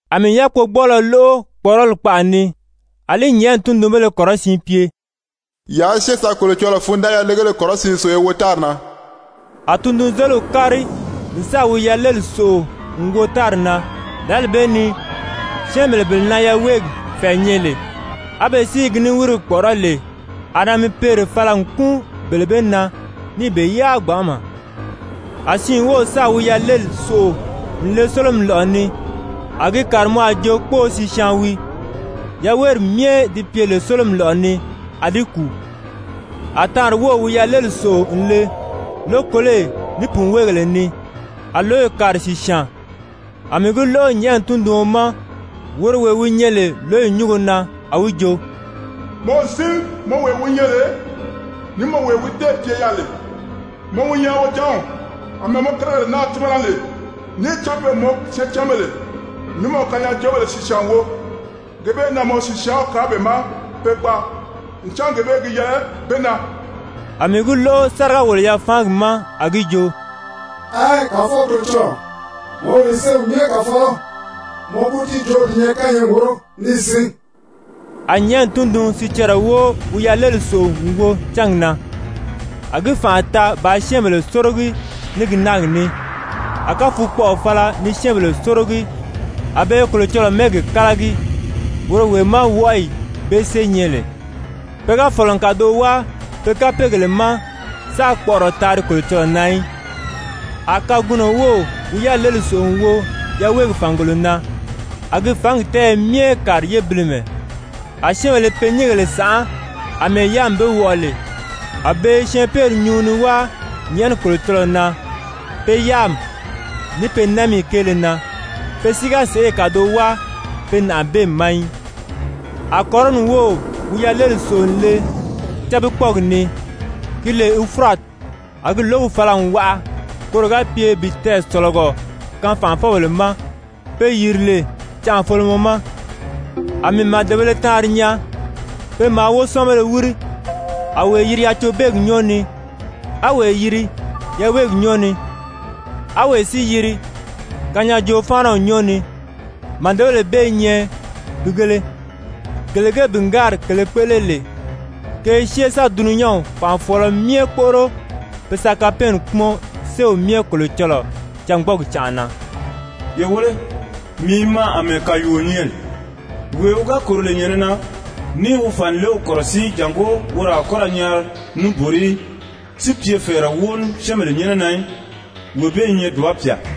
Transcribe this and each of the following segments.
A mii yákpogbɔɔlɔ lóʔo kpɔ̀ʔɔrɔli kpaʔa ni, a li nyɛ̀ʔɛni tundunbéle kɔrɔsiin pye: «Yaa syée ye sa Kolocɔlɔɔ fundanʔari yalegéle kɔrɔsiin sòʔo ye wo tári na!» A tundunzeliw kári n sáà wi yaleli sòʔo n wo tári na. Lǎli bee ni syɛ́ɛnbèle bele na yaweegi fɛ̀ɛ nyɛ lè, á be si i ki niwirigi kpɔ̀ʔɔrɔ́ lè, a namipeere fala n kúun bele bee na ni be yáa gbanʔama. A siin wów sáà wi yaleli sòʔo n le sólomi lɔ̀ʔɔ ni, a gi kàri mɔ a jo kpóō sìsyaan wii, yaweeri myɛ di pye lè sólomi lɔ̀ʔɔ ni, a di kùu. A taanri wów wi yaleli sòʔo n le lókoloyi ní pùnweegèle ni, a lǒyi kàri sìsyaan. A mii gi lóʔo nyɛ̀ʔɛni tunduɔn ma, woro wee wi nyɛ lè lǒyi nyúngo na, a wi jo: «Mɔ n sín, mɔ wee wi nyɛ lè ní mɔ wee wi téè pye yaà lè, mɔ wi nyɛ Wojanw àmɛɛ mɔ kérigèle naa tímana lè. Níì cán pe n mɔ syɛɛncanbèle ní mɔ kanyaajoobèle sìsyaan wo, gee bee na mɔ sìsyaanw kaan be ma pe gbaa, ncan gee bee gi yɛlɛ be na.» A mii gi lóʔo sáriga-wòlo-yafaangi ma, a gi jo: «Ɛɛn, Kàfɔw Kolocɔlɔɔ, mɔ wi lè Séew Myɛ Kàfɔlɔ, mɔ kútiijoori di nyɛ kányɛɛgi wóro níì sín.» A nyɛ̀ʔɛni tundun-sicɛrɛ wóo wi yaleli sòʔo n wo cángi na, a gi fànʔa taa bàā syɛ́ɛnbèle sórogi ní gi náagi ní. A káfukpɔʔɔ fala ni syɛ́ɛnbèle sórogi, a be i Kolocɔlɔɔ mɛ́ɛgi kálagi, woro wee má wɔʔɔyi bee sée nyɛ lè, pe ga fɔ̀lɔ n kàdoʔo wáa pe kapeegèle ma sáā kpɔʔɔrɔ taari Kolocɔlɔɔ na í. A kagunɔ wów wi yaleli sòʔo n wo yaweegi fàngolo na, a gi fǎngi tɛ́ɛyɛ myɛ kàri yébilimɛ. A syɛ́ɛnbèle i pe nyíngèle sànʔá àmɛɛ yáami be wɔʔɔ lè. A be i syɛɛnpeeri nyuu ni wáa nyɛ̀ʔɛni Kolocɔlɔɔ na pe yáami ní pe námiyi kéele na, pe si ga sèʔê kàdoʔo wáa pe nàʔabeemi ma í. A kɔrɔni wów wi yaleli sòʔo n le cábikpɔɔgi ni, ki lè Ufurati. A gi lǒgi fala n waʔa koro ga pye bi tɛɛsɔ̀lɔgɔ kaan fànʔafɔbèle ma, pe yìri lè canʔafolomɔ ma. A mii màdebēle taanri nyaa, pe maa wósɔɔnbéle wíri, a wee yiri yacobeegi nyɔ́ɔ ni, á wee yiri yaweegi nyɔ́ɔ ni, á wee si yiri kanyaajoo-fáanaw nyɔ́ɔ ni. Màdebèle bee i nyɛ pìigēle, gele ge bìngaari kèlē kpéʔele lè, ke i syée sa dulunyanw fànʔafɔɔlɔ myɛ kpóʔoro pe sa kapɛɛnni kpúmɔn Séew Myɛ Kolocɔlɔɔ cângbɔɔgi canʔa na. Ye wéle, mii i maa àmɛɛ kàyuuo nyɛ lè. Wee wi ga kòro lè nyɛ̀nɛ na ní i wi fànilew kɔ̀rɔsíi jàngó woro a kɔ́ ra nyaari níbori í, si pye fɛ̀ɛrɛ wóo ní syɛ́ɛnbèle nyɛ́nɛ na í, wee bee i nyɛ dùba pyà!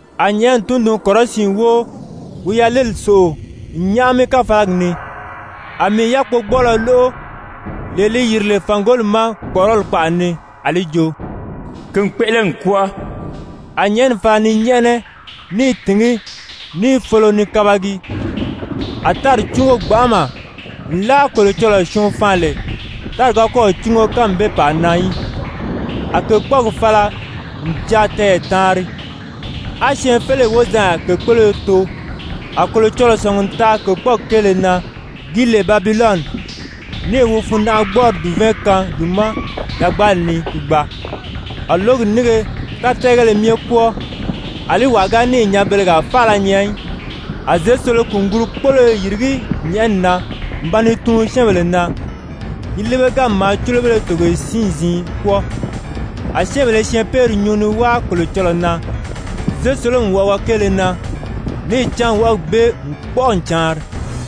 A nyɛ̀ʔɛni tundun-kɔrɔsiin wóo wi yaleli sòʔo n nyáʔami káfalagi ni. A mii yákpogbɔɔlɔ lóʔo, lee li yìri lè fàngoli ma kpɔ̀ʔɔrɔli kpaʔa ni, a li jo: «Ki n kpéʔele n kwɔ́ɔ.» A nyɛ̀ʔɛni fala ni nyɛ́ʔɛnɛ, ní i tìngí, ní i folo ni kabagi, a tári cúngo gbanʔama, nlaa Kolocɔlɔɔ syɔɔn faan lè, tári ga kɔ́ɔ̀ cúngo kánmi bee pàa na í. A kèkpɔɔgi fala n jaa tɛɛyɛ taanri, á syɛɛnfeleyi wozanya kèkpoloyo too. A Kolocɔlɔɔ sɔ̀ngi n taa kèkpɔɔgi kéele na, gi lè Babilɔni, níì wi fundanʔagbɔɔri dùvɛɛn kaan gi ma yagbaali ni ki gbaa. A lǒgi nínge tátɛɛgéle myɛ kwɔ́ɔ, àlí wàa ga níì nyanbelegaa faala nyaa í. A zěsolo-kùnguru-kpóloyo i yìrigí nyɛ̀ʔɛni na n ba ni tuun syɛ́ɛnbèle na, yi líbeganmi maa cúlobéle togoye siin-ziin kwɔ́ɔ. A syɛ́ɛnbèle i syɛɛnpeeri nyuu ni wáa Kolocɔlɔɔ na zěsolomi wɔʔɔgɔ kéele na, níì cán wɔʔɔgi bee n kpɔ́ʔɔ n caanri.